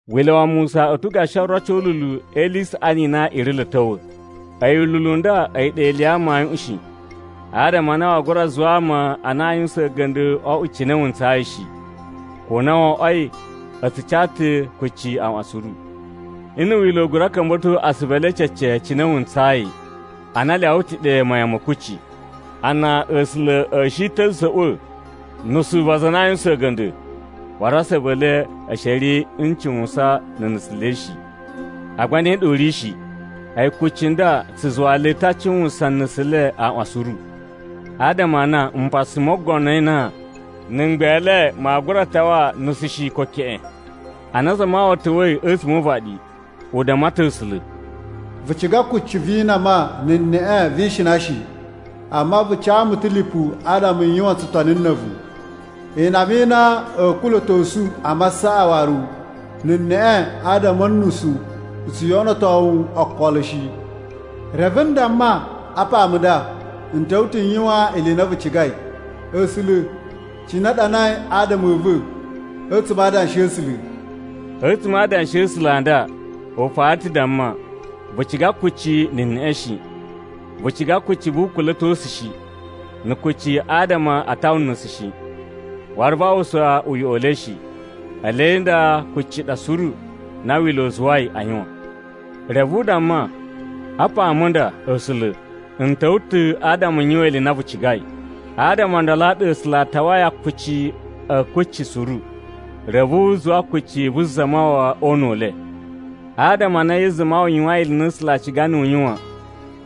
Wila̱ wa Musa u ta̱ gashi oroci o ululu e ili i saꞌani i na i ri lo a̱ ta̱wa̱. A̱yi ululu u nda a̱yi ɗa ili ya amayuꞌun shi, adama a na waa gura zuwa ama a na a yuwusan a̱ga̱nda̱ o oꞌwo cine wu ntsayi shi, ko na wo oꞌwoi a tsu ca ta̱ kucci aaꞌwan suru. Nna̱ Wila̱ u gura ka̱mba̱to asuvu e le cece cine wu ntsayi, ana a lyawa ta̱ ɗe mayan ma̱ kucci. Ana A̱sula̱ a̱ shi ta̱ a̱ za̱ꞌwa̱ nusu va aza a na a yuwusan a̱ga̱nda̱, waru asuvu e le a̱ shi a̱ ri n cuwusan na̱ nusu le shi. Agba ne ɗa u ri shi! A̱yi kucci nda tsu zuwa le ta̱ a cuwan nusu le a aaꞌwan suru. Adama a na mpasa mo ogono e inan na̱ mgbele maa gura tawa nusu shi ko keꞌen. Ana Zamawawa ta̱wa̱i a̱tsuma̱ o uvaɗi, u damma ta̱ A̱sula̱, “Vu ciga kucci vi inama na̱ neꞌe vi ishina shi. Amma vu ca mu ta̱ lipu adama n yuwan tsutoni na̱ a̱vu. Inama i na a̱a̱ kula̱tosu a masaꞌa waru na̱ neꞌe adama a̱ nusu tsu yoꞌonoto wu okolo shi. Reve n damma, ‘Apa mu nda, n ta̱wa̱ ta̱ n yuwan ili i na vu cigai, A̱sula̱, cine a ɗanai adama a̱ va̱ a̱tsuma̱ a Adanshi a̱ A̱sula̱.’” A̱tsuma̱ a Adanshi a̱ A̱sula̱ a nda u fara ta̱ damma, “Vu ciga kucci na̱ neꞌe shi. Vu ciga kucci vu ukula̱tosu shi, na̱ kucci adama a tawa nusu shi. Waru vaa uwwusa uyoꞌo u le shi.” (Ele nda kucci ɗa suru na Wila̱ u zuwai a yuwan.) Reve u damma, “Apa mu nda, A̱sula̱, n ta̱wa̱ ta̱ adama n yuwan ili i na vu cigai.” Adama o ndolo a ɗa A̱sula̱ a tawai akuci a̱ kucci suru, reve u zuwa kucci vu Zamawawa o una̱ u le. Adama a na Yesu Zamawawa yuwain ili i na A̱sula̱ a ciga niyi u yuwan,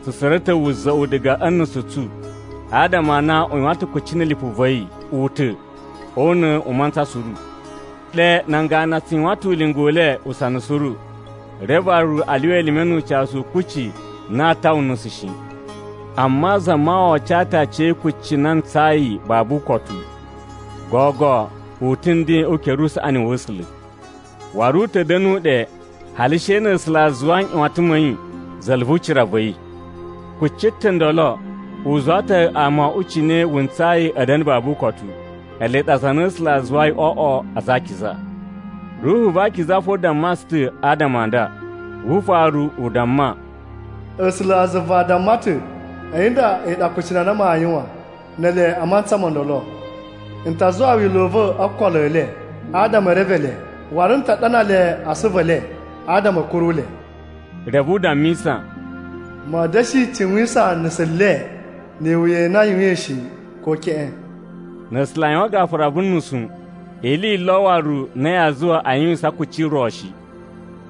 tsu tsura̱ ta̱ wuza̱ꞌu diga a̱ nusu tsu adama a na u yuwan ta̱ kucci na̱ lipu va̱ yi u ta̱ o una̱ u mantsa suru. Ɗe nan ganu a tsu yuwan ta̱ ulinga u le usana suru, reve waru a lyuwa elime nu ucasu u kucci na aa tawa nusu shi. Amma Zamawawa ca ta aciya̱yi kucci na ntsayi babu ukotu. Gogo u ta̱ nden o ukere usaꞌani wa̱ A̱sula̱. Waru u ta̱ da̱nu ɗe hali she na̱ A̱sula̱ a zuwa nꞌyuwatan ma̱ yi za̱la̱ vu ucira va̱ yi. Kucci ta̱ ndolo, u zuwa ta̱ ama o oꞌwo cine wu ntsayi a̱ da̱na̱ babu ukotu, ele ɗa aza a na A̱sula̱ a zuwai o oꞌwo aza a akiza. Ruhu va Akiza fo damma tsu ta̱ adama a nda. Wu ufaru u damma: “A̱sulazuva a damma ta̱, ‘A̱yi nda a̱yi ɗa akucunu a na maa yuwan ne ele a mantsa mo ndolo. N ta zuwa wila̱ u va̱ o okolo e le, adama e reve le. Waru n ta ɗana le a asuvu e le, adama a̱ kuru le.’” Reve u dammisa: “Ma̱a̱ da̱shi cuwisan nusu le ni iwuya i na a yuwain shi, ko keꞌen.” Na̱ A̱sula̱ a yuwan gafura vu nusu, ili yi lo waru na yaa zuwa a yuwisan kucci ro shi.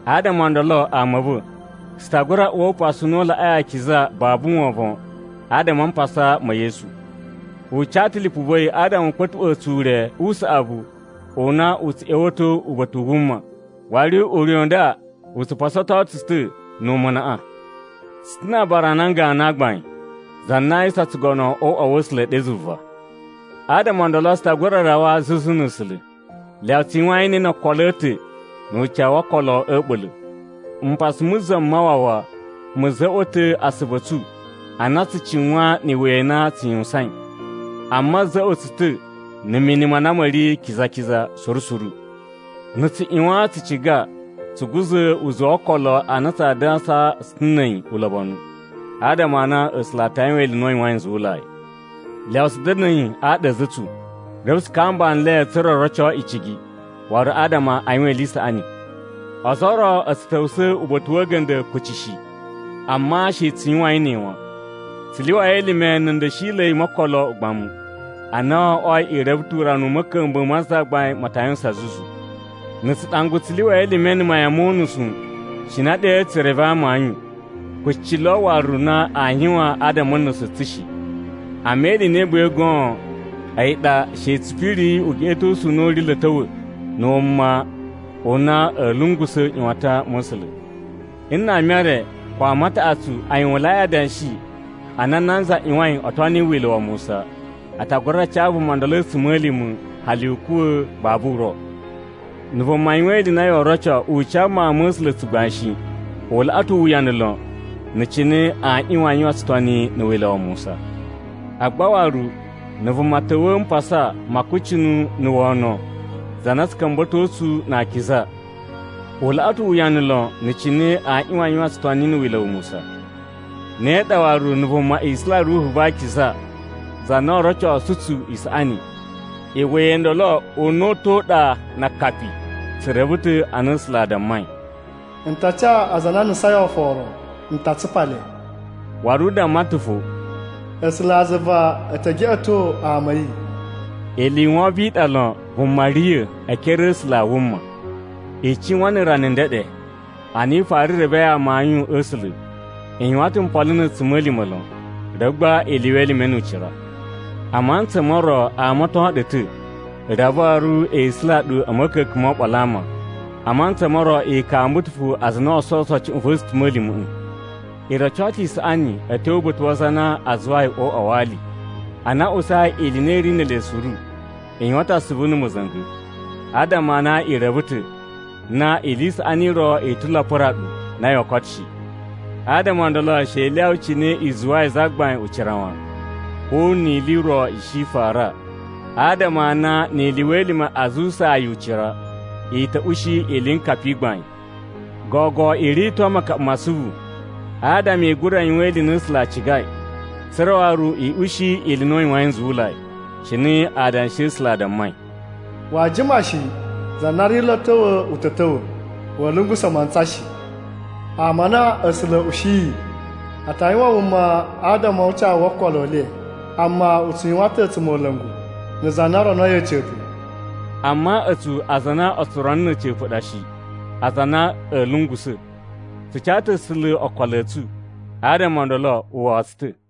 Adama o ndolo ama a̱ va̱, tsu ta gura uwa Upasu u na u Laꞌai Akiza babu wovon adama a mpasa ma̱ Yesu. U ca ta̱ lipu va̱ yi adama u kpa̱tuꞌwa̱a̱ tsu ure u saꞌavu u na u tsu ꞌya̱wa̱to uba̱ta̱ u wuma! Waru ure u nda u tsu pasato tsu ta̱ nu umunaꞌa. Tsu ta̱ na̱ aabara a nan ganu a gbain za na a yuwusan tsugono o uꞌwa wa̱ A̱sula̱ ɗe zuva. Adama o ndolo tsu ta gura rawa zuzu na̱ A̱sula̱. Lyawa tsu yuwain ne no okolo a̱ ta̱ nu ucawu wo okolo a̱ a̱ɓula̱. Mpasa mu Zamawawa mu za̱ꞌwa̱ ta̱ asuvu a̱ tsu a na tsu cuwan ni iwuya i na tsu yuwusain, amma a̱ za̱ꞌwa̱ tsu ta̱ na̱ mini ma na ma̱ ri kiza-kiza suru suru. Na̱ tsu ꞌyuwan tsu ciga tsu guza̱ uzuwu wo okolo a na tsaa dansa tsu ta̱ na̱ a̱yi ulobonu, adama a na A̱sula̱ a ta yuwan ili i na u yuwain nzuwulai. Lyawa tsu da̱na̱i aɗa a̱ a̱za̱ a̱ tsu, reve tsu kamba nle tsa̱ra̱ o roco icigi, waru adama a yuwan ili i saꞌani. Ozo o ro a̱ tsu ta̱wusa̱ uba̱ta̱ wa̱ a̱ga̱nda̱ kuci shi, amma she tsu yuwain ne wan. Tsu lyuwai elime na̱ nda̱shila̱i mo okolo ugbamu, a na wo oꞌwoi i reve ta̱ urana u ma̱ka̱mba̱a̱ ma Zagbain ma ta yuwusan zuzu. Na̱ tsu ɗangwa tsu lyuwai elime na̱ mayan mo unusu cina ɗe tsu reve amayun, kucci lo waru na aa yuwan adama a̱ nusu tsu shi. Amma ili i na i buwai goon a̱yi ɗa she tsu piriyi ugeꞌetosu u na u ri lo a̱ ta̱wa̱ na̱ wuna u na a̱a̱ lungusa̱ nꞌyuwatan ma̱ A̱sula̱! Nna ama e re ko ama a taꞌatsu a yuwunlai adanshi a na nanza ꞌyuwain o toni Wila̱ wa Musa, a ta gura ca vuma ndolo a̱tsuma̱lima̱ hali u kuwa̱ babu uro. Na̱ vuma yuwan ili i na yoo roco u ca Mawun ma̱ A̱sula̱ tsugbain shi, u laꞌa ta̱ uwuyanu lon na̱ cine aa ꞌyuwan a yuwan tsutoni na̱ Wila̱ wa Musa. Agba waru, na̱ vuma ta̱wa̱a̱ mpasa ma akucunu na̱ wono za na tsu ka̱mba̱to tsu na akiza, u laꞌa ta̱ uwuyanu lon na̱ cine aa ꞌyuwan a yuwan tsutoni na̱ Wila̱ wa Musa. Ne ɗa waru, na̱ vuma isula Ruhu va Akiza, za na o rocosu tsu isaꞌani, iwuya i ndolo una̱ta̱ u ɗa na akapi. Tsu reve ta̱ a na A̱sula̱ a dammai, “N ta ca aza a na a nusain oforo. N ta tsupa le.” Waru u damma ta̱ fo, “A̱sulazuva e te geꞌeto ama a̱ yi.” Ili i wovon i ɗa lon vuma riya̱ e ekere a̱ A̱sula̱ a wuma. I cuwan na̱ rana ndeɗe, ana i fara revei amayun a̱ A̱sula̱. I yuwan ta̱ mpolo na̱ a̱tsuma̱lima̱ lon, reve gba i lyuwa elime nu ucira. A mantsa mo ro a amaton ɗu ta̱ reve waru e isula ɗu a̱ ma̱ka̱ka̱n mo oɓolo a ama. A mantsa mo ro i kamba ta̱ fo aza a na o sowuso cuꞌun va̱ a̱tsuma̱lima̱ꞌa̱. I roco ta̱ isaꞌani a̱ tyo uba̱ta̱ wa aza a na a zuwai o uꞌwa wa ali. Ana a usai ili i na i ri ne ele suru, i yuwan ta̱ asuvu na̱ ma̱za̱nga̱, adama a na i reve ta̱ na ili i saꞌani i ro i ta̱ lo a pura ɗu na yoo koto shi. Adama o ndolo, she i lyawa cine i zuwayi Zagbain ucira wan, ko ni ili i ro i shi i fara, adama a na ni i lyuwa elime a zuwusaa yi ucira, i ta̱ ushi iliyinkapa i gbain. Gogo i rito makaɓa ma asuvu, adama i gura yuwan ili i na A̱sula̱ a cigai, tsa̱ra̱ waru i ushi ili i na u yuwain nzuwulai. Cine Adanshi a̱ A̱sula̱ a dammai, “Waa jima shi za na ri lo a̱ ta̱wa̱ u ta̱ ta̱wa̱. Wa̱a̱ lungusa̱ mantsa shi. Ama a na A̱sula̱ a̱ ushiyi a ta yuwan wuma adama o ucawu wo okolo e le. Amma u tsu yuwan ta̱ a̱tsumola̱ngu na̱ za na ronoi a̱ca̱pa̱.” Amma a̱tsu aza a na o tso rono na̱ a̱ca̱pa̱ ɗa shi, aza a na a̱a̱ lungusa̱. Tsu ca ta̱ A̱sula̱ okolo a̱ tsu, adama o ndolo, u wawa tsu ta̱.